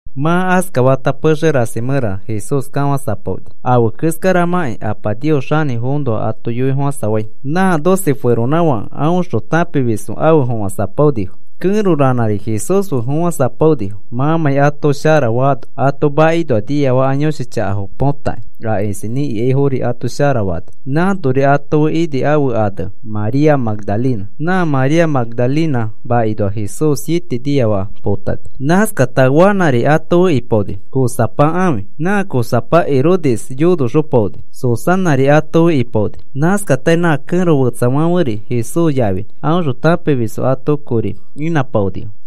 Mã askafata pexe rasi mẽra Jesús kafãsapaoni. Afe keskaramakĩ Apa Nios xanĩfoõnoa ato yoifofãsafai. Nã doce feronãfake aõxõ tãpimisfo afe fofãsapaonifo. Kẽro ranãri Jesús fe fofãsapaonifo, mãmãi ato sharafaano ato makinoa niafaka yõshi chaka potakĩ, a isinĩ ikaifori ato sharafani. Nãnori ato fe ini ãfe ane María Magdalena. Nã María Magdalena makinoa Jesús siete niafaka potani. Nãskata Juanãri ato fe ipaoni, Cuzapa ãfi. Nã Cuzapa Herodes yonoxopaoni. Susanãri ato fe ipaoni. Nãskatari nã kẽro fetsafãferi Jesús yafi aõxõ tãpimisfo ato kori inãpaonifo.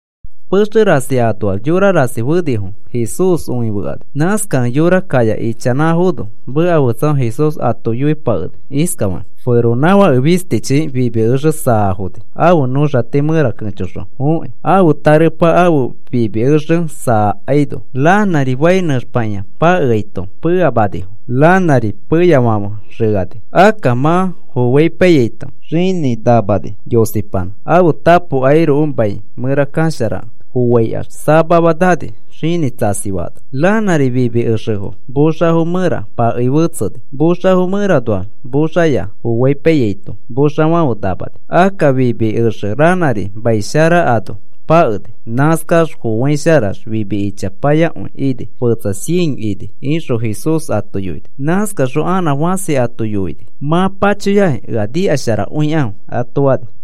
Pexe rasi anoax yora rasi fenifo, Jesús õifekani. Nãskakẽ yora kaya ichanãfono meka fetsafaxõ Jesús ato yoipakeni iskafakĩ: “Feronãfake fistichi fimi exe saafoni ãfe nõxati mẽra kẽchoxõ fokĩ. Ãfe tarepa ãfe fimi exe saakaino ranãri fai nẽxpakĩa pakeaito peamanifo, ranãri peyafãfe xẽani. Akka mã foaipaiyaito xinĩ namani, yosipanã, ãfe tapo airoko mai mẽra kasharakẽ. Foaikax samama nani xinĩ tsasifaano. Ranãri fimi exefo moxafo mẽra pakei fetseni. Moxafo mẽranoax moxafoya foaipaiyaito moxafãfe namani. Akka fimi exe ranãri mai shara ano pakeni. Nãskax foaisharax fimi ichapayakõi ini fetsa cien ini,” ixõ Jesús ato yoini. Nãskaxõ anã fãsi ato yoini: “Mã pachoyakĩ ea nikasharakõikãfe,” ato fani.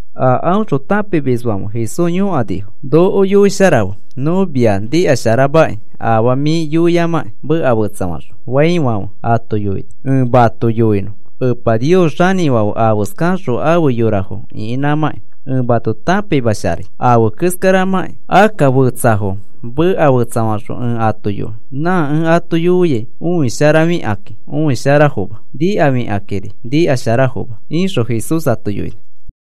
A aõxõ tãpimisfãfe Jesús yõkanifo: “Noko yoisharafe, nõ mia nikasharamakĩ afaa mĩ yoiamãki meka fetsafaxõ,” faifãfe ato yoini: “Ẽ mato yoinõ Epa Nios xanĩfãfe afeskaxõ afe yorafo ĩkinãmãki, ẽ mato tãpimasharai afe keskaramãki. Akka fetsafo meka fetsafaxõ ẽ ato yoi. Nã ẽ ato yoiai õisharafikakĩ õisharafoma. Nikafikakĩri nikasharafoma,” ixõ Jesús ato yoini.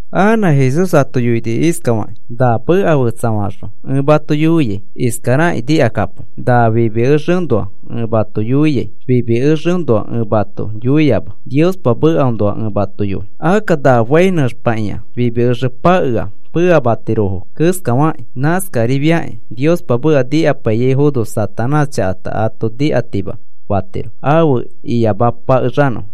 Anã Jesús ato yoini iskafakĩ: “Na meka fetsafaxõ ẽ mato yoiai iskarakĩ nikakapo. Na fimi exeõnoa ẽ mato yoiai, fimi exeõnoa ẽ mato yoima. Niospa mekaõnoa ẽ mato yoi. Akka na fai nẽxpakĩa fimi exe pakea peamatirofo keskafakĩ, nãskarifiakĩ Niospa meka nikapaiyaifono Satanás chakata ato nikatima fatiro afe iyamapakexanõfo.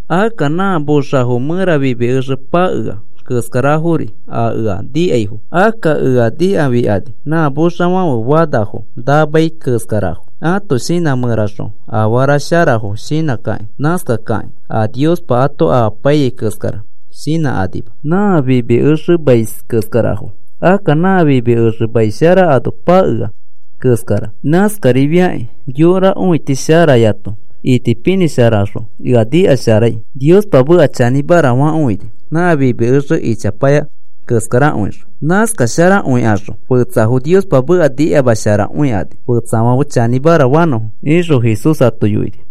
Akka nã moxafo mẽra fimi exe pakea keskarafori a ea nikaifo. Akka ea nikafikani, nã moxafãfe fanafo namai keskarafo, ãto shinã mẽraxõ afara sharafo shinãkakĩ. Nãskakakĩ a Niospa ato amapaiyai keskara shinãkanima. Nã fimi exemais keskarafo. Akka nã fimi exe mai shara ano pakea keskara. Nãskarifiakĩ yora õiti sharayato itipinĩsharaxõ ea nikasharai, Niospa meka chanĩmara fakõini, nã fimi exe ichapaya keskarakõixõ. Nãskasharakõikaxõ fetsafo Niospa meka nikamasharakõikani fetsafãfe chanĩmara fanõfo,” ixõ Jesús ato yoini.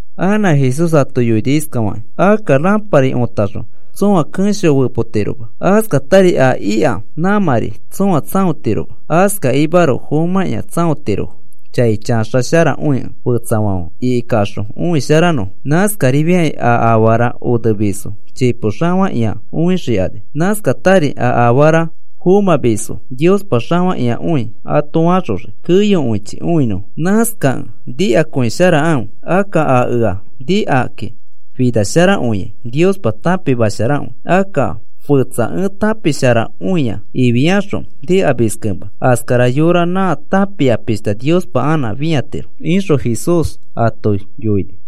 Anã Jesús ato yoini iskafakĩ: “Akka rãpari õtaxõ tsõa kẽsho fepotiroma, askatari a ika nãmãri tsõa tsãotiroma. Askakimaroko fomãkĩa tsãotirofo, chai chaxasharakõikẽ fetsafãfe ikikaxõ õisharakõinõfo. Nãskarifiakĩ a afara oneyomis chipo xafakĩakõi õixikani. Nãskatari a afara fomãyomisfo Niospa xafakĩakõi ato faxoxii keyokõichi õinõfo. Nãskakẽ nikakõisharakãfe. Akka a ea nikakĩ finasharakõiai Niospa tãpimasharakõi. Akka fetsa ẽ tãpisharakõia ifiaxõ nikamiskẽma, askara yora nã tãpia pishta Niospa anã fĩatiro,” ixõ Jesús ato yoini.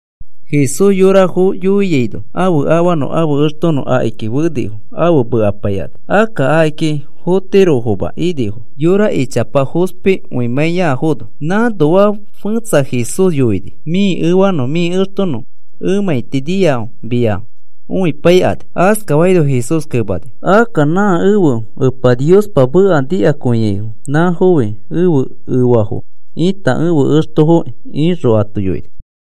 Jesús yorafo yoiaino ãfe afanõ ãfe extonõ akiki fenifo afe mekapaikani. Akka akiki fotirofoma inifo, yora ichapa fospikõimãiyafono. Nãnoa fẽtsa Jesús yoini: “Mĩ efanõ mĩ extonõ emãiti niafo mia õipaikani.” Askafaino Jesús kemani: “Akka nã ẽfe Epa Niospa meka nikakõiaifo nãfofi ẽfe efafo ita ẽfe extofoki,” ixõ ato yoini.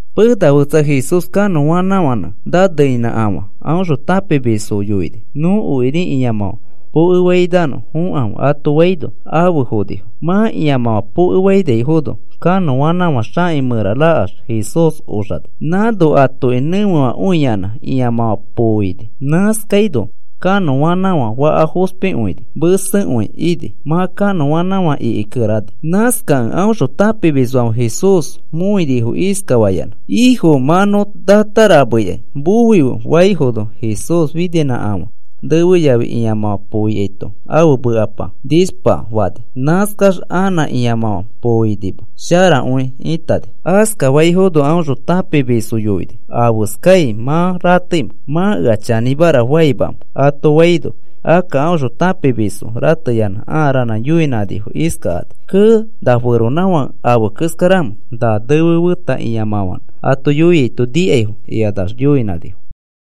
Pena fetsa Jesús kanõanãfãnẽ naneinĩkafã aõxõ tãpimisfo yoini: “Nõ okiri ĩamãfã pokefainõ fokãfe,” ato faino afe fonifo. Mã ĩamãfã pokefainaifono kanõanãfã xaki mẽra rakax Jesús oxani. Nãno atoki nẽfefakõiyanã ĩamãfã poo ini. Nãskaino kanõanãfã faka fospikõini mesekõi ini mã kanõanãfã ikikerani. Nãskakẽ aõxõ tãpimisfãfe Jesús mõinifo iskafayanã: “Ifo, mã nõ natarameikai, moife,” faifono, Jesús fininãkafã nefe yafi ĩamãfã poo ikaito ãfe mekapa nishpa fani. Nãskax anã ĩamãfã poo inima, sharakõi ĩtani. Askafaifono aõxõ tãpimisfo yoini: “¿Afeskai mã rateimẽ? ¿Mã ea chanĩmara faimamẽ?” ato faino, akka aõxõ tãpimisfo rateyanã ãa ranã yoinãnifo iskakani: “¡Kee! ¿Na feronãfake afe keskaramẽ na nefe feta ĩamãfãnẽ ato yoiaito nikaifo?” ikanax yoinãnifo.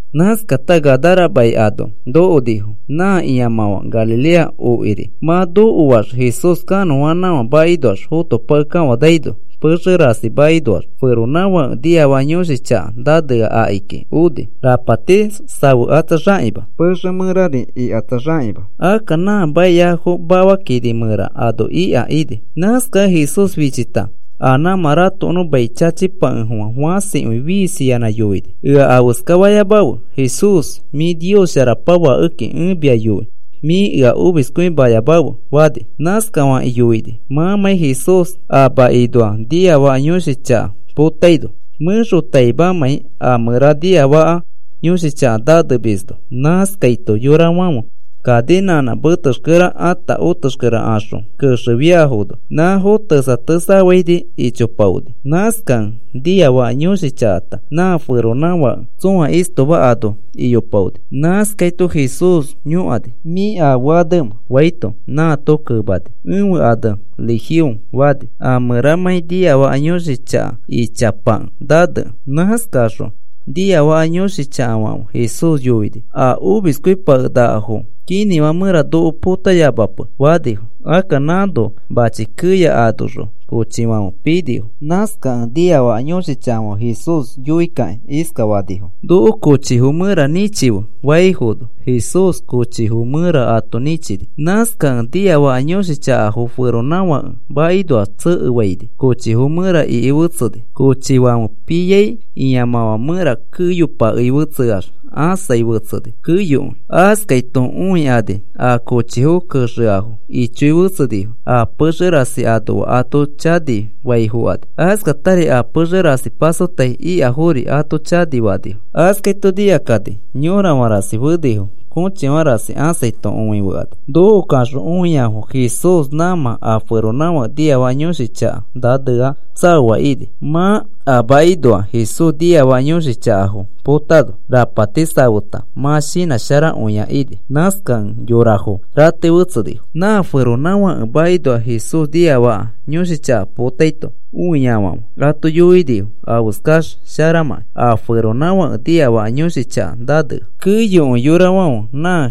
Nãskata Gadara mai ano nokonifo, nã ĩamãfã Galilea okiri. Mã nokoax Jesús kanõanãfã makinoax fotopakekafanaino, pexe rasi makinoax feronãfake niafaka yõshi chaka nanea akiki oni. Rapati safekatsaxakima. Pexe mẽrari ikatsaxakĩma. Akka nã maiafo mafa kini mẽra ano ika ini. Nãskakẽ Jesús fichita a nãmã ratokonõ mai chachipakefofã fãsikõi fiisiyanã yoini: “¡Ea afeska fayamafe, Jesús! Mĩ Nios Sharapa Fakeki ẽ mia yoi mĩ ea omiskõimayamafe,” fani. Nãskafakĩ yoini mãmãi Jesús a makinoa niafaka yõshi chaka potaino, mẽxotaimamãi a mẽra niafaka yõshi chaka nanemisno. Nãskaito yorafãfe kaninãnã metexkere ata otexkere axõ kexefiafono, nãfo tesaketsafaini ichopaoni. Nãskakẽ niafaka yõshi chakata nã feronãfake tsõa istoma ano iyopaoni. Nãskaito Jesús yõkani: “¿Mĩ afe anemẽ?” faito, nãato kemani: “Ẽfe ane Legión,” fani, a mẽramãi niafaka yõshi chaka ichapa nanekẽ. Nãskaxõ niafaka yõshi chakafãfe Jesús yoinifo: “A omiskõipakenakafo kinĩfã mẽra noko potayamape,” fanifo. Akka nãno mãchi keya anoxõ kochifãfe pinifo. Nãskakẽ niafaka yõshi chakafãfe Jesús yoikakĩ iskafanifo: “Noko kochifo mẽra nĩchife,” faifono Jesús kochifo mẽra ato nĩchini. Nãskakẽ niafaka yõshi chakafo feronãfake makinoax tsekefaini kochifo mẽra iki fetseni. Kochifãfe pifiai ĩamãfã mẽra keyopakei fetseax ãsai fetseni, keyokõi. Askaito õikani a kochifo kexeafo ichoi fetsenifo, a pexe rasi anoa ato chanifai fokani. Askatari a pexe rasi pasotai ikafori ato chanifanifo. Askaito nikakani yõrafã rasi fenifo kochifã rasi ãsaito õifekani. Nokokaxõ õiafo Jesús nãmã a feronãfake niafaka yõshi chaka nanea tsaoa ini, mã a makinoa Jesús niafaka yõshi chakafo põtano. Rapati safeta mã shinãsharakõia ini. Nãskakẽ yorafo ratei fetsenifo. Nã feronãfake makinoa Jesús niafaka yõshi chaka potaito, õiafãfe ato yoinifo afeskax sharamãkĩ a feronãfake niafaka yõshi chaka nanea. Keyokõi yorafãfe nã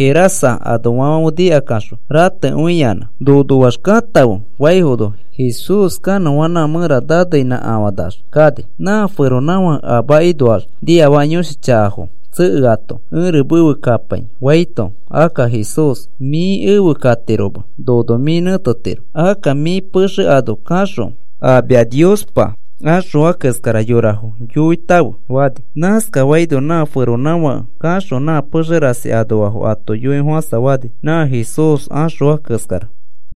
Gerasa anoafãfe nikakaxõ ratekõiyanã. “Nonoax katãfe,” faifono, Jesús kanõanãfã mẽra naneinãkafanax kani. Nã feronãfake a makinoax niafaka yõshi chakafo tsekeato, “Ẽri mefe kapai,” faito, akka Jesús, “Mĩ efe katiroma. Nono mĩ nẽtetiro. Akka mĩ pexe ano kaxõ a mia Niospa axõa keskara yorafo yoifotãfe,” fani. Nãskafaino nã feronãfake kaxõ nã pexe rasi anoafo ato yoifofãsafani nã Jesús axõa keskara.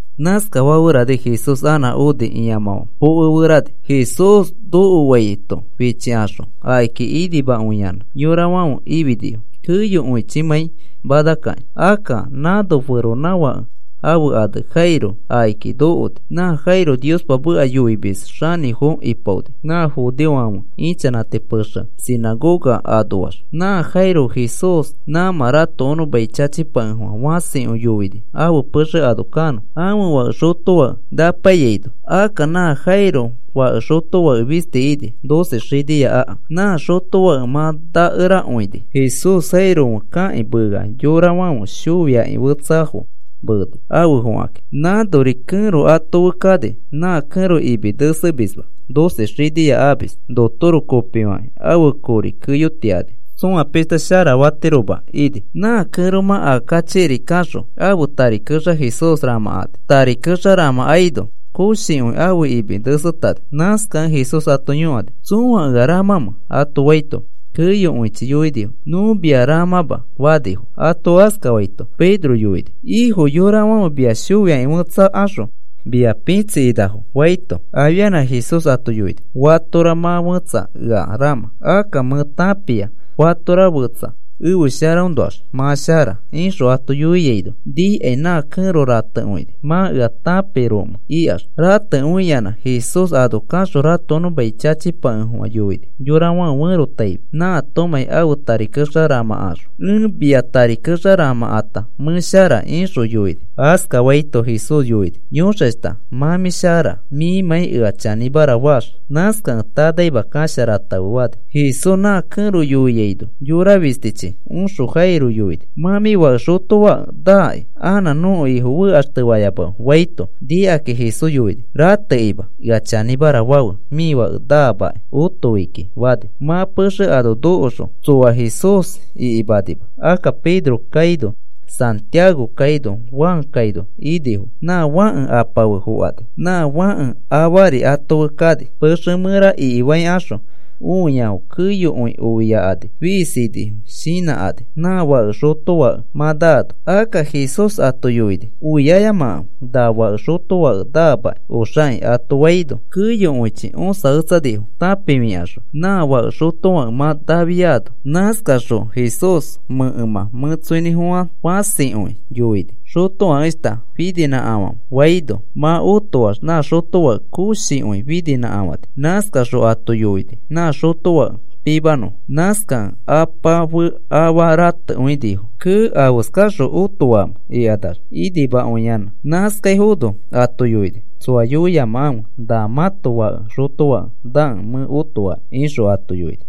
Nãskafaferani Jesús anã oni ĩamãfã pokeferani. Jesús nokoaito fichikaxõ akiki inimakõiyanã yorafãfe ifinifo keyokõichimãi manakakĩ. Akka nãno feronãfake ãfe ane Jairo akiki nokoni. Nã Jairo Niospa meka yoimis xanĩfo ipaoni nã judeofãfe ichanãti pexe sinãgoga anoax. Nã Jairo Jesús nãmã ratokonõ mai chachipakefofã fãsikõi yoini ãfe pexe ano kanõ, ãfe fake xotofake napaiyaino. Akka nã Jairo fake xotofake fisti ini, doce xinia aka. Nã xotofake mã nakerakõini. Jesús Jairo fe kakĩ meea yorafãfe shoiakĩ fetsafo meeni afe fokakĩ. Nãnori kẽro ato fe kani. Na kẽro imi nesekima, doce xinia amis. Notoro kopifakĩ ãfe kori keyotiani. Tsoa pĩshta sharafatiroma ini. Nã kẽromã aa kachikiri kaxõ ãfe tari kexa Jesús ramãkani. Tari kexa ramãkaino koshikõi ãfe imi nesetani. Nãskakẽ Jesús ato yõkani: “¿Tsõa ea ramãmẽ?” ato faito, keyokõichi yoinifo: “Nõ mia ramãma,” fanifo. Ato askafaito Pedro yoini: “Ifo, yorafãfe mia shoiaki fetsakaxõ mia pitsikinafo,” faito, afianã Jesús ato yoini: “Fatora mã fẽtsa ea ramã. Akka mẽ tãpia fatora fetsa ẽfe sharaõnoax mã shara,” ixõ ato yoiaino, nikai nã kẽro ratekõini. “¿Mã ea tãpiaromẽ?” ikax ratekõiyanã Jesús ano kaxõ ratokonõ mai chachipakefofã yoini yorafãfe ferotaifi nãatomãi ãfe tari kexa ramãkaxõ. “Ẽ mia tari kexa ramãkata mẽ shara,” ixõ yoini. Askafaito Jesús yoini: “Yõxashta, mã mĩ shara mĩmãi ea chanĩmara faax. Nãskakẽ tanaima kasharatãfe,” fani. Jesús nã kẽro yoiaino, yora fistichi oxõ Jairo yoini: “Mã mĩ fake xotofake naaki. Anã nõko Ifo fekaxtefayamafe,” faito, nikakĩ Jesús yoini: “Ratekima. Ea chanĩmara fãfe mĩ fake naamakĩ otoi kiki,” fani. Mã pexe ano nokoxõ, tsoa Jesús ikikinima. Akka Pedro kaino Santiago kaino Juan kaino inifo nã fãke apa fe fokani, nã fãke afari ato fe kani. Pexe mẽra ikifaikaxõ õiafo keyokõi oiakani fiisinifo shinãkani nã fake xotofake mã naano. Akka Jesús ato yoini: “Oiayamakãfe. Na fake xotofake naamakĩ oxaki,” ato faino, keyokõichi õsaketsanifo, tãpifikaxõ nã fake xotofake mã nafiano. Nãskaxõ Jesús mẽkemã mẽtsoinĩfofã fãsikõi yoini: “Xotofakeshta, fininãkafãfe,” faino, mã otoax nã xotofake koshikõi fininãkafani. Nãskaxõ ato yoini nã xotofake pimanõfo. Nãskakẽ apa fe afa ratekõinifo. “¡Kee! ¿Afeskaxõ otoamẽ?” ikanax inimakõiyanã. Nãskaifono ato yoini: “Tsoa yoiyamakãfe nã mãto fake xotofake nakẽ mẽ otoaki,” ixõ ato yoini.